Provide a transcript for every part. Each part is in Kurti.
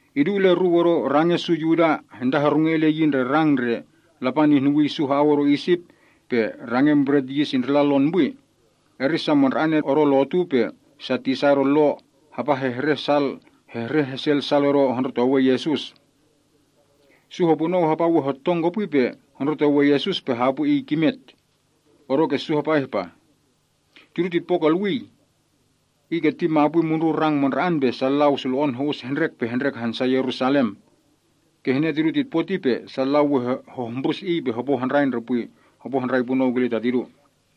Idu ileruu odo range’ su Yuda hantahorunge ile yi ndre rang ndre Lapan ihnuwii su ha‑au odo Isip, pe rangen Bret Yis Indrila Lon Pwi, eri sa mandra‑ane odo lotu pe sa tisa odo Lo hapa hehreh hesel sal odo hondrotowe Yesus. Su hopunou hapa we hotong kopwi pe hondrotowe Yesus pe hapwi Iy kimet. Odoke su hapa ihpah, “Tidu titpo kolwii oh. Iy keti ma mundrun rang mandra‑an pe sa lau sulo‑on ho‑us hendrek pe hendrek hansa Yerusalem. Kihne tidu titpo ti pe sa lau we hohmbrus Iy pe hopo handrai punou kile ta tidu.”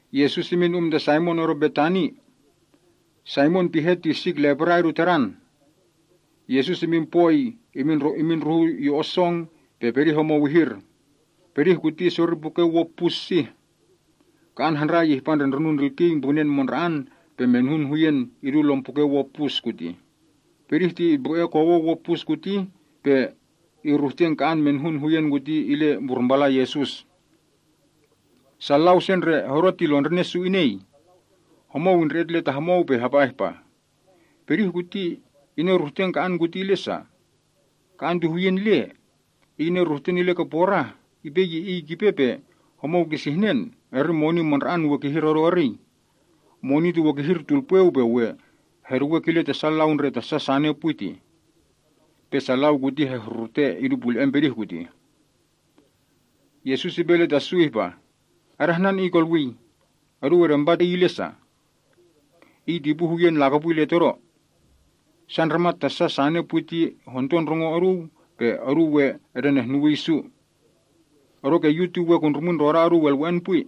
Yesus imin um ta Saimon odo Betani. Saimon pihe ti sik lepra idu tadan. Yesus imin pwoi imin ndruhun yo‑on song, pe pedih homou ihir. Pedih kuti isori puken wo pus sih. Ka‑an handrai ihpa ndre ndronun ndrilkiya mbrunen mandra‑an pe menuhun huyen idu lom puken wo kutih. Pedih ti itmbru‑e kowen wo pus kuti pe iruhten ka‑an menuhun huyen kuti ile mburmpalan Yesus. Sa lau se ndre hodo ti lon ndrine’ su inei. Homou indre‑et ile ta homou pe hapa ihpah, “Pedih kuti ineruhten ka‑an kuti ile sa? Ka‑an ti huyen le. Iy ineruhten ile ke porah. Ipe ye iy kipe pe homou kisihnen, eri moni mandra‑an we kihir odo eriy. Moni ti we kihir tulpweu, pe lehpe heduwe kile ta sa lau ndre tasa sane pwi tih.” Pe sa lau kuti hehrurute idu pule‑en pedih kutih. Yesus ipe ile ta su ihpa, “Adahnan iy kolwii! Oduu edempa iy ile sa? Iy ti ipu huyen lakopwi ile Todo. Sa ndramat tasa sane pwi ti we honto ndrongo oduu sei ihpa ke sei, pe oduu we edenehnuwii su. Odoke Yu ti we kundrumwin ndrodan oduu elwe‑en pwi.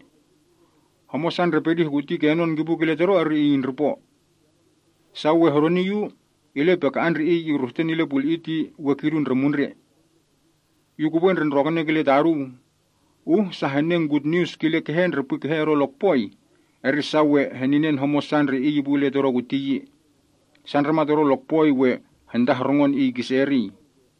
Homosa ndre pedih kuti kenon kipu kile Todo eri iy indripo. Sa we hedoni Yu, ile pe ka‑an ndre iy iruhten ile puli‑i ti we kidu ndre mundre. Yu kupwe ndre ndrokene kile ta oduu, uh sa henen gutnius kile kehe ndre kehe odo lokpoi, eri sa we heninen homosa ndre iy ipu ile Todo kuti yi. Sa ndramat odo lokpoi we hentahorungon iy kise eriy.”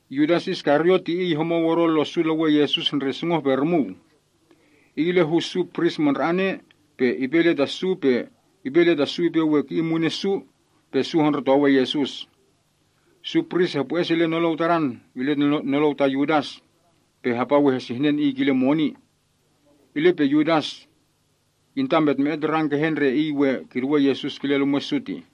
Yudas Iskariot ti iy homou odo lo’ su lewen Yesus ndre sungoh-pe-rumuu. Iy ile hu su pris mandra‑ane, pe ipe ile ta su ipe we ki‑in munen su, pe su hondrotowe Yesus. Su pris hepwo‑es ile nolou ta Yudas, pe hapa we hesihnen iy kile moni. Ile pe Yudas intametme‑et rang kehe ndre iy we kiduwe Yesus kile lumwe’ su tih.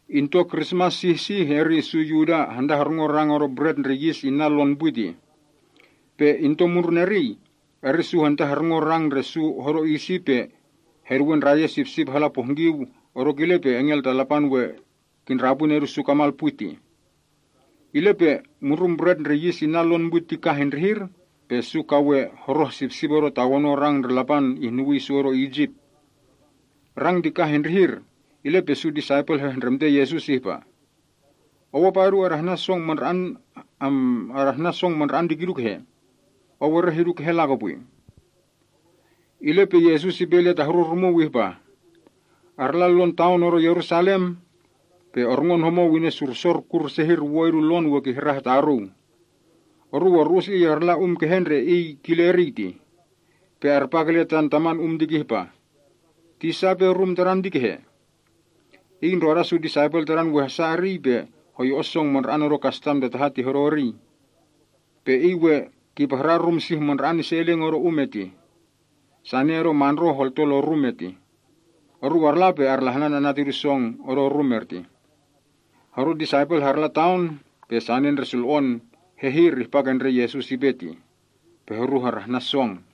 Into Krismas sih pe sih, eri su Yuda hantahorungon rang odo Bret Ndre Yis Inna Lon Pwi tih. Pe into mundrun eriy, eri su hantahorungon rang ndre su hodo Isip pe heduwe ndrayen sipsip hala pohngkiu odo kile pe engel ta Lapan we kindrapwi nedu’ su kamal pwi tih. Ile pe mundrun Bret Ndre Yis Inna Lon Pwi ti kah indrihir, pe su ka we horoh sipsip odo tawonon rang ndre Lapan ihnuwii su odo Isip. Rang ti kah indrihir, ile pe su disaipel hehndremte Yesus ihpa, “Ou apa odu adahnan song mandra‑an ti kidu kehe? Ou ereh idu kehe lakopwi?” Ile pe Yesus ipe ile ta horu rumuu ihpah, “Oruu arla lon taon odo Yerusalam. Pe orngon homou inesursor kur sehir wo idu lon we kihrah taruu. Oruu oru‑us iy arla um kehe ndre iy kile eriy tih. Pe arpa kile tan taman um ti kihpah, ‘Tisa ipe rum Tadan ti kehe? Iy ndroda su disaipel Tadan we hasa eriy pe hoyo‑on song mandra‑an odo kastam ta taha ti hodo eriy.’ Pe iy we kipahran rum sih mandra‑an ise eleng odo um etih. Tepol pe sia holto lon rum ertih. Oruu arla pe arlahnan ana’ tidu song odo rum etih.” Horu disaipel harla taon, pe sane ndre sulo‑on hehir ihpa ke ndre Yesus ipe tih. Pe horu harahnan song.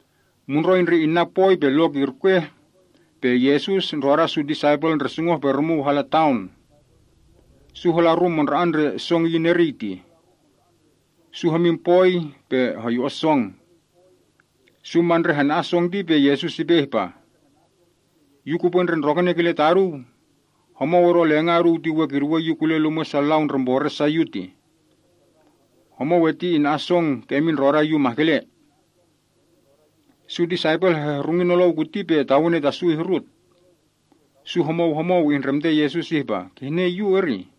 Mundroi ndre inna pwoi pe lok irkweh, pe Yesus ndroda su disaipel ndre sungoh-pe-rumuu hala taon. Su hala rum mandra‑an ndre song iyin eriy tih. Su hodo pwoi pe hoyo‑on song. Su ma ndre hana‑an song ti pe Yesus ipe ihpa, “Yu kupwe ndre ndrokene kile ta oduu, homou odo lenga’ oduu ti we kiduwe Yu kule lumwe’ sa lau ndre mbore’ sa Yu tih. Homou erti ina‑an song kemin ndroda Yu mahkele.” Su disaipel hehrungi nolou kuti pe tawene ta su ihrut. Su homou homou ihndremte Yesus ihpah, “Kihne yu, erih?”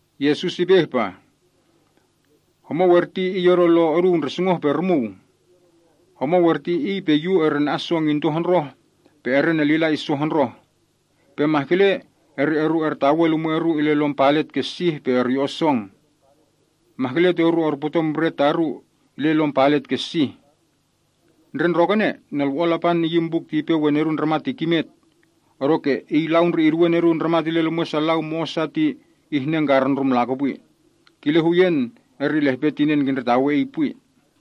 Yesus ipe ihpah, “Homou erti iy odo lon oduu ndre sungoh-pe-rumuu. Homou erti iy pe Yu erena‑an song into hondroh pe erenelila iso hondroh. Pe mahkele eri oru ertawe lumwe’ oru ile lom palet ke sih pe oryo‑on song. Mahkele ti oru orputon bret taru ile lom palet ke sih. Ndre ndrokene, Nolwo‑on Lapan iyin buk ti ipe we Nedun Ndramat ti kimet, odoke iy lau ndre iduwe Nedun Ndramat ile lumwe’ su lau mo‑osa ti ihnan hono‑on karundrum lakopwi. Kile huyen, eri lehpe tinen kindretawe iy pwi.”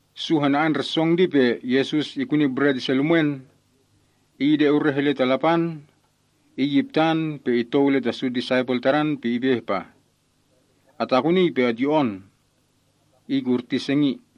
Su hana‑an ndre song ti pe Yesus ikuni bret ise lumwen, Iy ide ureh ile ta Lapan, Iy iptan, pe itou ile ta su disaipel pe ipe ihpah, “Atakunii pe otyo‑on. Iy kurti sengi.”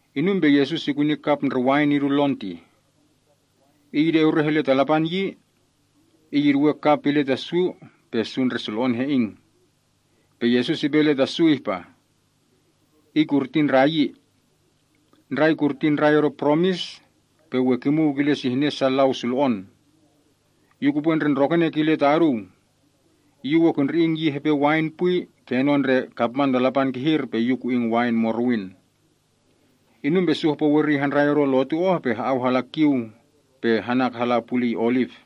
Inum pe Yesus ikuni kap ndre wain idu lon tih. Iy ide ureh ile ta Lapan yi, Iy iduwe kap ti ile ta su pe su ndre sulo‑on he‑ing. Pe Yesus ipe ile ta su ihpah, “Iy kurti ndrayi. Ndrai kurti ndrai odo poromis, pe we kimuw kile sihnen sa lau sulo‑on. Yu kupwe ndre ndrokene kile ta oduu, Yu we kundri‑ing yi hepe wain pwi, kenon ndre kapman ta Lapan kihir pe Yu ku‑ing wain morowin.” Inum pe su hopo weriy handrai odo lotu oh pe ha‑au hala kiu, pe hanak hala puliy Oliv.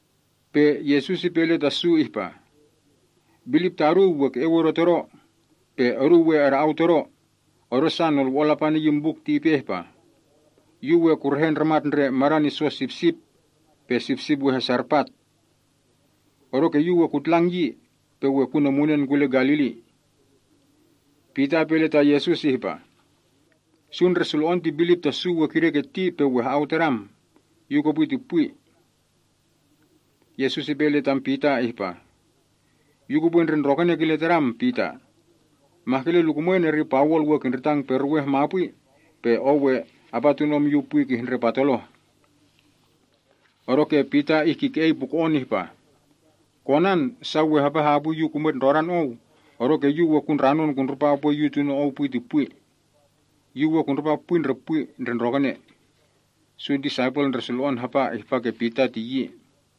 Pe Yesus ipe ile ta su ihpah, “Bilip ta oduu we ke‑eu odo Todo, pe oduu we ada‑au Todo, odosa nolwo‑on Lapan iyin buk ti ipe ihpa, “‘Yu we kuruhe ndramat ndre madan iso ta sipsip, pe sipsip we hasarpat.’ Odoke Yu we kutlang yi, pe we kunemunen kule Galili.” Pita ipe ile ta Yesus ihpa, “Su ndre sulo‑on ti bilip tasu we kideketi pe su we ha‑au Tadam. Yu kopwi ti pwi.” Yesus ipe ile tadan ihpah, “Yu kupwe ndre ndrokene kile tadam, Pita. Mahkele lukumwen eri pawol we kindritang peruweh mapwi, pe ou we apa tunom Yu pwi kihndre patoloh.” Odoke Pita ihkike‑ei puko‑on ihpah, “Konan, sa we hapa hapwi yu kumwet ndrodan Ou, odoke yu we kundranon kundripa upwe yu tuno Ou pwi ti pwi. Yu we kundripa pwi ndre ndrokene.” Su disaipel ndre sulo‑on hapa ihpa ke Pita ti yi.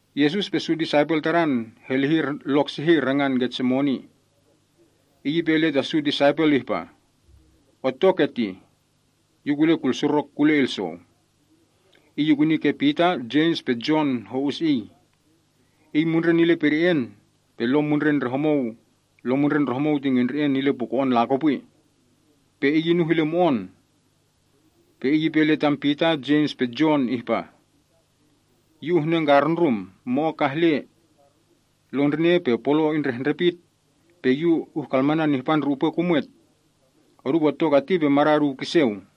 Yesus pe su disaipel Tadan helihir lok sehir, rangan Getsemani. Iy ipe ile ta su disaipel ihpah, “Otto ketih. Yu kule kulsurok kule ilsou.” Iy ikuni ke Pita, Jems pe Jon ho‑us Iy. Iy mundren ile pede‑en, pe lom mundren ndre homou ti ngendre‑en ile puko‑on lakopwi. Pe Iy inuh ile mo‑on. Pe Iy ipe ile tam Pita, Jems pe Jon ihpah, “Yu uhnangkarundrum. Mo‑o kah le. Lon ndrine pe polo indrehndrepit, pe Yu uhkalmanan ihpa ndre upwe kumwet. Odu otto keti pe mada’ oduu kiseu.”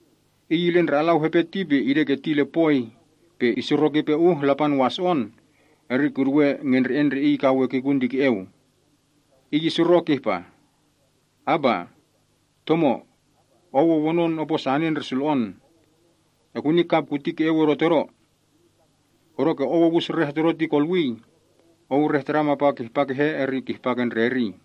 Iy ile ndre alau hepe ti pe ideketi ile poi, pe isurok ipe uh Lapan waso‑on, eri kiduwe ngendre‑en ndre Iy kawe kikun ti ke‑eu. Iy isurok ihpah, “Aba, a Tomo, Ou owonon opo sane ndre sulo‑on. Ekuni kap kuti ke‑eu odo Todo. Odoke Ou owus reh Todo ti kolwii. Ou reh Tadam apa we kihpa kehe eri kihpa ke ndre eriy.”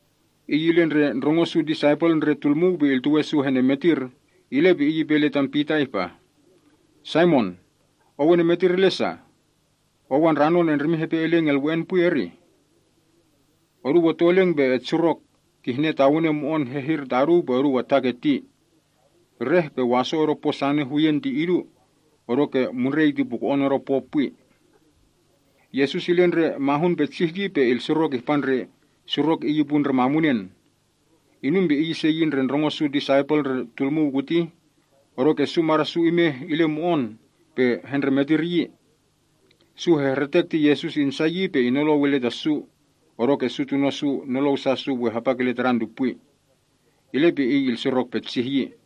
Iy ile ndre ndrongo su disaipel ndre tulmuu pe iltuwe su hendremetir, ile pe Iy ipe ile tam Pita ihpah, “Saimon, ou enemetir ile sa? Ou andranon endrimin hepe eleng elwe‑en pwi, erih? Oduu otto eleng pe etsurok, kihne tawene mo‑on hehir ta oduu pe oduu ataketi. Reh pe waso odo po sane huyen ti idu, odoke mundrei ti puko‑on odo po pwi.” Yesus ile ndre mahun petsih yi, pe ilsurok ihpa ndre surok Iy ipu ndre mamunen. Inum pe Iy ise yi ndre ndrongo su disaipel ndre tulmuu kuti, odoke su mada’ su imeh ile mo‑on pe hendremetir yi. Su hehretek ti Yesus insa yi pe inolou ile ta su, odoke su tuno’ su nolou sa su we hapa kile Tadan ti pwi. Ile pe Iy ilsurok petsih yi.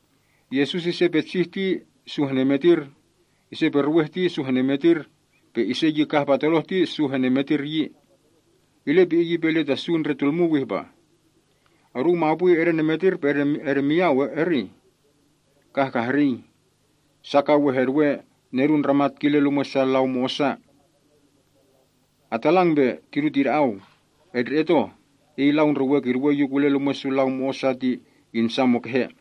Yesus ise petsih ti su henemetir, ise peruweh ti su henemetir, pe ise yi kah patoloh ti su henemetir yi. Ile pe Iy ipe ile ta su ndre tulmuu ihpah, “Oduu mapwi edenemetir pe edemiyau, erih? Kah kahrii! Sa ka we heduwe Nedun Ndramat kile lumwe’ sa lau mo‑osa. Atalang pe tidu tida‑au. Etndre‑et oh, iy lau ndre we kiduwe Yu kule lumwe’ sa lau mo‑osa ti insa mukehe!”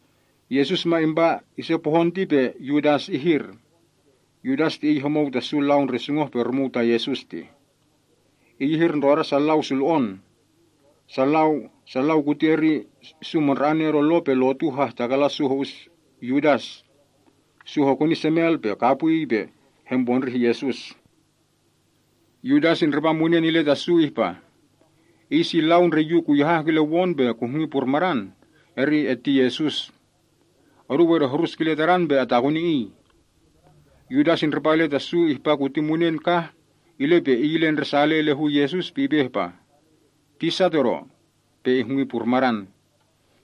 Yesus ma impa ise pohon ti pe Yudas ihir. Yudas ti iy homou ta sa lau ndre sungoh-pe-rumuu ta Yesus. Iy ihir ndroda sa lau sulo‑on. Sa lau kuti eri su mandra‑ane odo Lo pe lotu hahtakalan su ho‑us Yudas. Su hokuni semel pe kapwiy pe helpondrih Yesus. Yudas indripa munen ile ta su ihpah, “Iy si lau ndre yu kuyahah kile won pe kuhngi purmadan, Iy eti Yesus. Oduu edehrus kile Tadan pe atakuni Iy.” Yudas indripa ile ta su ihpa kuti munen kah, ile pe iy ile ndresale ile hu Yesus pe ipe ihpa, “Tisa todo,” pe ihngwi purmadan.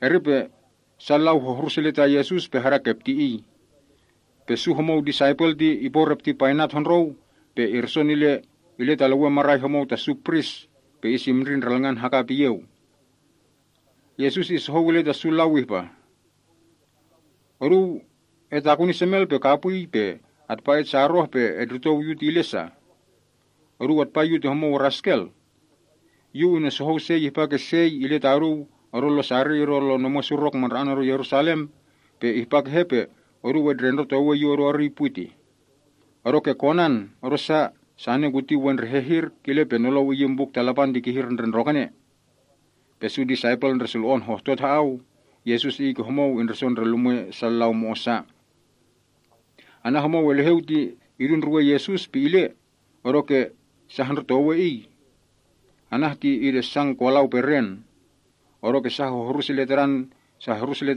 Eri pe sa lau hohrus ile ta Yesus pe hadakepti Iy. Pe su homou disaipel ti iporepti painat hondrou pe irson ile ta lewen marai homou ta su pris, pe isimndri ndralngan hakap iyeu. Yesus isohou ile ta sa lau ihpah, “Oduu etakuni semel pe kapwiy, pe atpa etsaroh pe etndrotou Yu ti ile sa? Oduu atpa Yu ti homou raskel? Yu unesohou sei ihpa ke sei ile taduu odo lon sariy odo omwen surok mandra‑an odo Yerusalem, pe ihpa kehe pe oduu etndrendrotowe Yu odo eriy pwi? Odoke konan, odosa sane kuti we ndre hehir, kile pe nolou iyin Buk ta Lapan ti kihir ndre ndrokene.” Pe su disaipel ndre sulo‑on hohtot ha‑au. Yesus Iy ke homou indriso ndre lumwe’ sa lau mo‑osa. Anah homou eleheu ti idu ndruwen Yesus pe ile, odoke sa hondrotowe iy. Anah ti idesan kolau peren. Odoke sa hohrus ile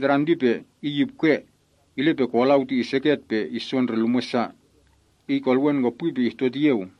tadan ti pe iy ipkwe, ile pe kolau ti iseket pe iso ndre lumwe’ sa. Iy kolowen ke pwi pe ihtot iyeu.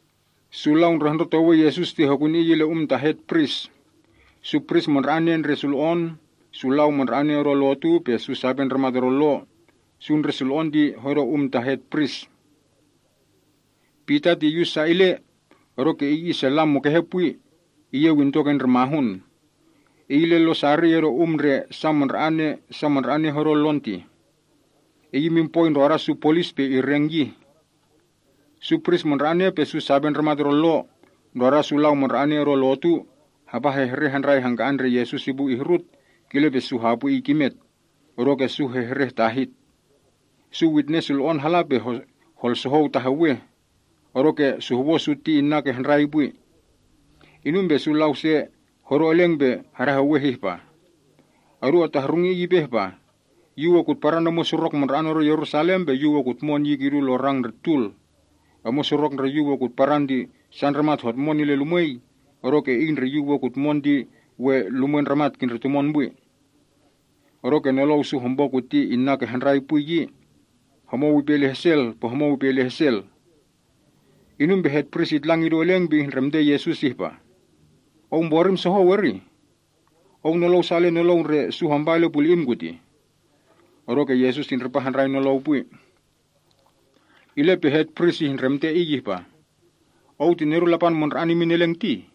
Su lau ndre hondrotowe Yesus ti hokuni Iy ile um ta hetpris. Su pris mandra‑ane ndre sulo‑on, su lau mandra‑ane odo lotu, pe su sape ndramat odo lo, su ndre sulo‑on ti hodo um ta hetprisa. Pita ti iyus sa ile, odoke iy isella mukehe pwi, iyeu into ke ndre mahun. Iy ile lon sariy odo um ndre sa mandra‑ane hodo lon tih. Iy imin pwoi ndroda su polis pe ireng yih. Su pris mandra‑ane pe su sape ndramat odo lo, ndroda su lau mandra‑ane odo lotu, hapa hehreh handrai hangka‑an ndre Yesus ipu ihrut, kile pe su hapwi Iy kimet, odoke su hehreh tahit. Su witnes sulo‑on hala pe holsohou taheweh, odoke suhwo’ su inna ke handrai pwi. Inum pe sa lau se hodo eleng pe hadaheweh ihpah, “Odu atahrungi Iy ipe ihpah, ‘Yu we kutparan omwen surok mandra‑an odo Yerusalem, pe Yu we kutmon yi kidu lon rang ndre tul. Omwen surok ndre Yu we kutparan ti sa ndramat hotmon ile lumwei, odoke iy ndre Yu we kutmon ti we lumwen ndramat kindretumon pwi!’” Odoke nolou su hopo kuti inna ke handrai pwi yi. Homou ipe ile hesel pe homou ipe ile hesel. Inum pe hetpris itlang idu eleng pe ihndremte Yesus ihpah, “Ou mborim sohou, erih? Ou nolou sa ile nolou ndre su hampa ile puli‑im kutih?” Odoke Yesus indripa handrai nolou pwi. Ile pe hetpris ihndremte Iy ihpah, “Ou ti Nedun Lapan Mandra‑an Imin Eleng, tih?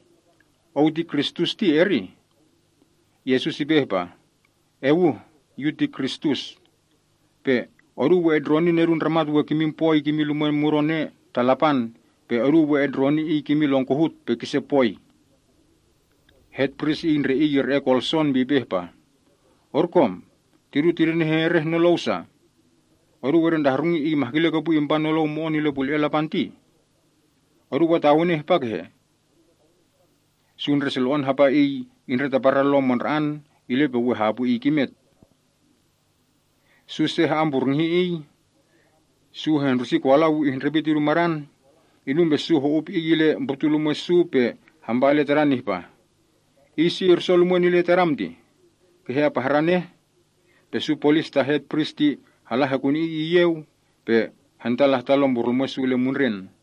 Ou ti Kristus tih, erih?” Yesus ipe ihpah, “Ewuh, Yu ti Kristus. Pe oduu we etndroni Nedun Ndramat we kimin sia ise lumwei mudon ea ta Lapan, pe oduu we etndroni Iy kimin lon kohut pe kise pwoi.” a Hetpris iy ndre iy ire‑ei kolson pe ipe ihpah, “Orkom! Tidu tidenehereh nolou sa yi? Oduu etndretahrungi Iy mahkele kopwi impa nolou mo‑on ile pule‑en Lapan tih! Oduu atawene ihpa kehe?” Su ndre sulo‑on hapa Iy indretaparan Lo mandra‑an, ile pe we hapwi Iy kimet. Su se ha‑amburngihi Iy. Su hehndrusi kolau ihndrepit idu madan. Inum pe su ho‑up Iy ile mbrutulumwe’ su pe hampa ile Tadan ihpah, “Iy si irson lumwen ile Tadam tih? Kehe apahran eh?” Pe su polis ta hetpris ti hala hekuni Iy iyeu, pe hentalahtan lompurlumwe’ su ile mundren.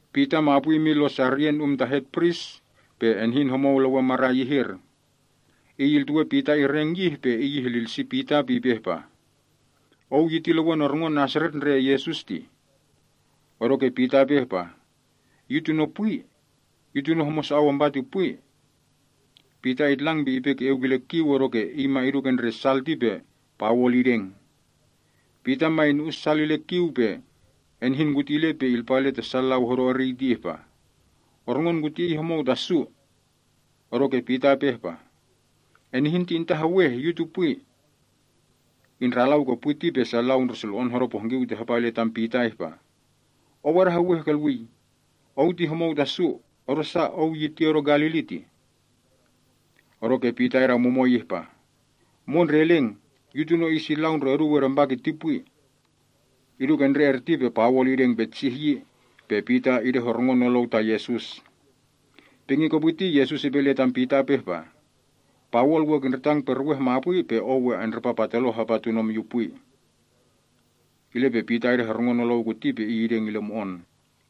Pita mapwi imin lon sariyen um ta hetpris, pe enihin homou lewen marai ihir. Iy iltuwe Pita ireng yih, pe iy ihlilsi Pita, pe ipe ihpah, “Ou yi ti lewen orngon Naseret ndre Yesus tih!” Odoke Pita ipe ihpah, “Yu tuno pwi. Yu tuno homosa ou ampa ti pwi.” Pita itlang pe ipe ke‑eu kile kiu, odoke iy ma idu ke ndre sal ti pe pawol ideng. Pita ma inu‑us sal ile kiu ti pe enihin kuti ile pe ipe ile ta sa lau hodo eriy ti ihpah, “Orngon kuti iy homou ta su.” Odoke Pita ipe ihpah, “Enihin ti intaheweh, yu ti pwi.” Indralau ke pwi ti pe sa lau ndre hodo pohngkiu ti hapa ile tam Pita ihpah, “Ou adaheweh kolwii. Ou ti homou ta su, odosa ou yi ti odo Galili.” Odoke Pita idamumoi ihpah, “Mondre eleng, yu tuno iy lau ndre oduu edempa kiti pwi!” Idu ke ndre erti pe pawol ideng petsih yi, pe Pita idehorungon nolou ta Yesus. Pingi kopwi ti Yesus ipe ile tam Pita ihpah, “Pawol we kindritang peruweh mapwi, pe ou we andripa patoloh apa tunom Yu pwi.” Pita idehorungon nolou kuti pe iy ideng ile mo‑on.